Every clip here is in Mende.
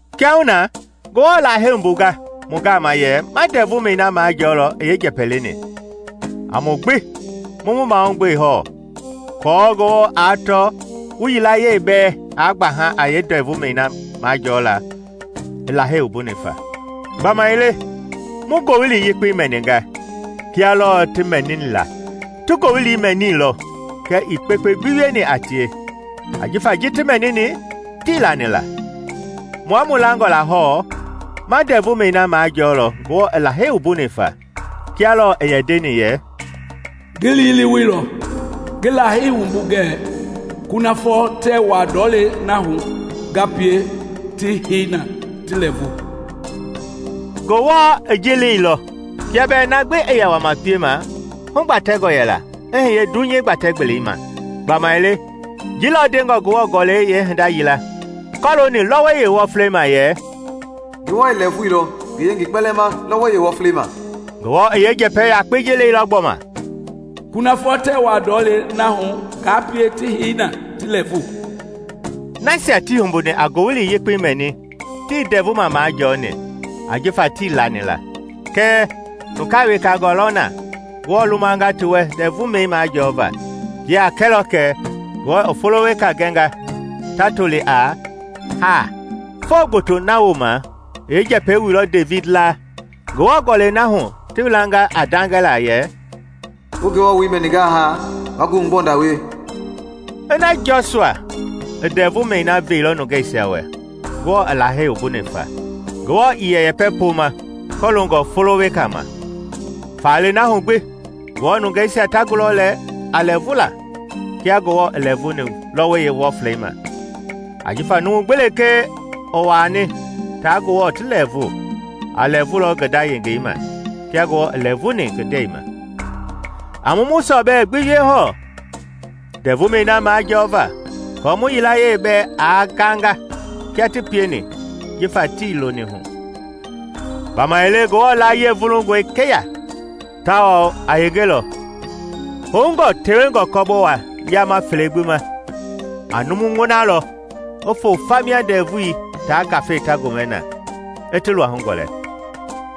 Kiahuna, Ngewɔ i Lahei wumbunga mu gama yɛ ma ndɛvumɛi na majɔɔlɔ i yeenjɛpɛ leni, a mu gbi mu mu mahugbe hɔɔ aako Ngewɔ aa tɔ wu yilayee bɛɛ aa gbaha a yeendɛvumɛi na majɔɔla i Lahei wumbuni fa. Gbamaile mu Ngowili Yekpei mɛninga, kia lɔɔ ti mɛniila. Ti ngoowili mɛniilɔ kɛɛ ii kpekpe gbi wieni a tie, ajifa ji ti mɛnini, tii lani la. Mua mu langɔ la hɔɔ, ma ndɛvumɛi na majɔɔlɔ Ngewɔ i Lahei wumbuni fa. Kia lɔɔ i yɛ ndeni yɛ, “Ngi liileweilɔ, ngi Lahei wumbu ngɛɛ, ‘Kunafɔ tɛɛ wuaa ndɔlei na hu ngaa pie ti hei na ti lɛɛvu!’” Ngewɔ i ji leilɔ kia bɛɛ na gbi i yɛ wama piema hugbatɛngɔ yɛla i hiye dunyei gbatɛ-gbelei ma. Gbamaile ji lɔ ndengɔ Ngewɔ Gɔlɛi yeehinda yila kɔlooni lɔwɔi yeewɔflei ma yɛ, “Ngewɔ i lɛɛvuilɔ ngi yengei kpɛlɛɛ ma lɔwɔi yeewɔflei ma.” Ngewɔ i yeenjɛpɛ yakpei ji leilɔ gbɔma, “Kunafɔ tɛɛ wuaa ndɔlei na hu ngaa pie ti hei na ti lɛɛvu.” Nasia ti humbuni a Ngowili Yekpei mɛni tii ndɛvuma majɔɔni, ajifa tii lani la. Kɛɛ nungaa wekangaa lɔ na Ngewɔ lumanga ti wɛ ndɛɛvumɛi majɔɔva. Ji a kɛlɔ kɛ Ngewɔ i folo weka gɛnga ta toli a “Haa.” Foo gboto na wooma i yeenjɛpɛi wuilɔ Devidi laa Ngewɔ Gɔlɛi na hu ti welanga a ndagɛla yɛ, “Wu Ngewɔ woi mɛningaa haa, waa ngoohugbɔnda wie.” Ina Jɔsua i ndɛvumɛi na veilɔ nungeisia wɛ Ngewɔ i Lahei wumbuni fa, Ngewɔ ii yɛ yɛpɛ pooma kɔloongɔ folo weka ma. Faale na hu gbi, Ngewɔ nungeisia ta gulɔ lɛ a lɛɛvula kia Ngewɔ i lɛɛvuni lɔwɔi yeewɔflei ma. Ajifa numu gbi lekee i wuani taa Ngewɔ ti lɛɛvu, a lɛɛvulɔ ngi nda yengei ma kia Ngewɔ i lɛɛvuni ngi ndɛi ma. A mu mu sɔbɛ gbi wie hɔɔ ndɛvumɛi na majɔɔva aako mu yilayee bɛɛ aa ganga kia ti pieni jifa tii liiloni. Gbamaile Ngewɔ laayiɛi vulungɔe keya tawao a yengelɔ, houngɔ tewengɔ kɔbowa yaama fele gbi ma. A numu ŋɔnalɔ i foo fa mia ndɛvui taa ngafei ta gomɛ na i ti luahu gɔlɛ,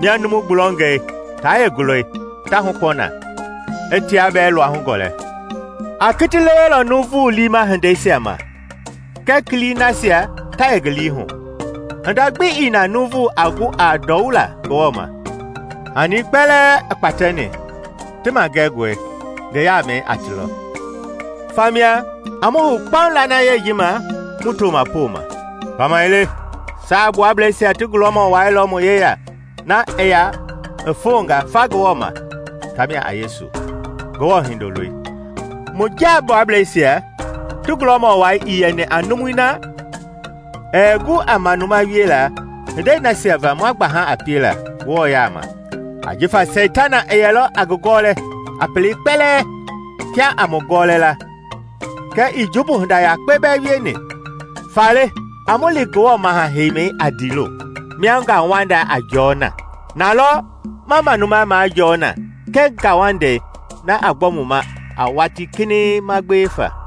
mia numu gbulɔngɛi taa yeengulɔi ta hukpɔ na, i tia bɛɛ luahu gɔlɛ. A kiti lewelɔ nuuvu liima hindeisia ma kɛɛ kilii nasia ta yɛ ngi lii hu. Hinda gbi ii na nuuvu aa gu a ndɔwula Ngewɔ ma; hani kpɛlɛɛ i kpatɛni ti magɛngɔe, ngi yaamɛi a ti lɔ. Famia, a mu hou kpaŋ lanayei ji ma mu tooma pooma. Gbamaile Saagbuablɛisia ti gulɔmɔ wai lɔ mu yeya na i ya i fonga fa Ngewɔ ma, tamia a Yesu, Ngewɔ Hindoloi. Mu jaagbuablɛisia ti gulɔmɔ wai ii yɛni a numui na ɛɛ gu a manuma wiela hindei nasia va ma gbaha a piela Ngewɔ yaama; ajifa Seitana i yɛlɔ a ngi gɔlɛ a pelei kpɛlɛɛ kia a mu gɔɔlɛ la kɛɛ ii jumbu hinda yakpe bɛɛ wieni. Faale a mu li Ngewɔ maha heimɛi a ndiilo, mia ngauwanda a jɔɔ na. Na lɔ ma manuma majɔɔ na kɛɛ ngauwandei na a gbɔ mu ma a watii kinɛiŋ ma gbewe fa.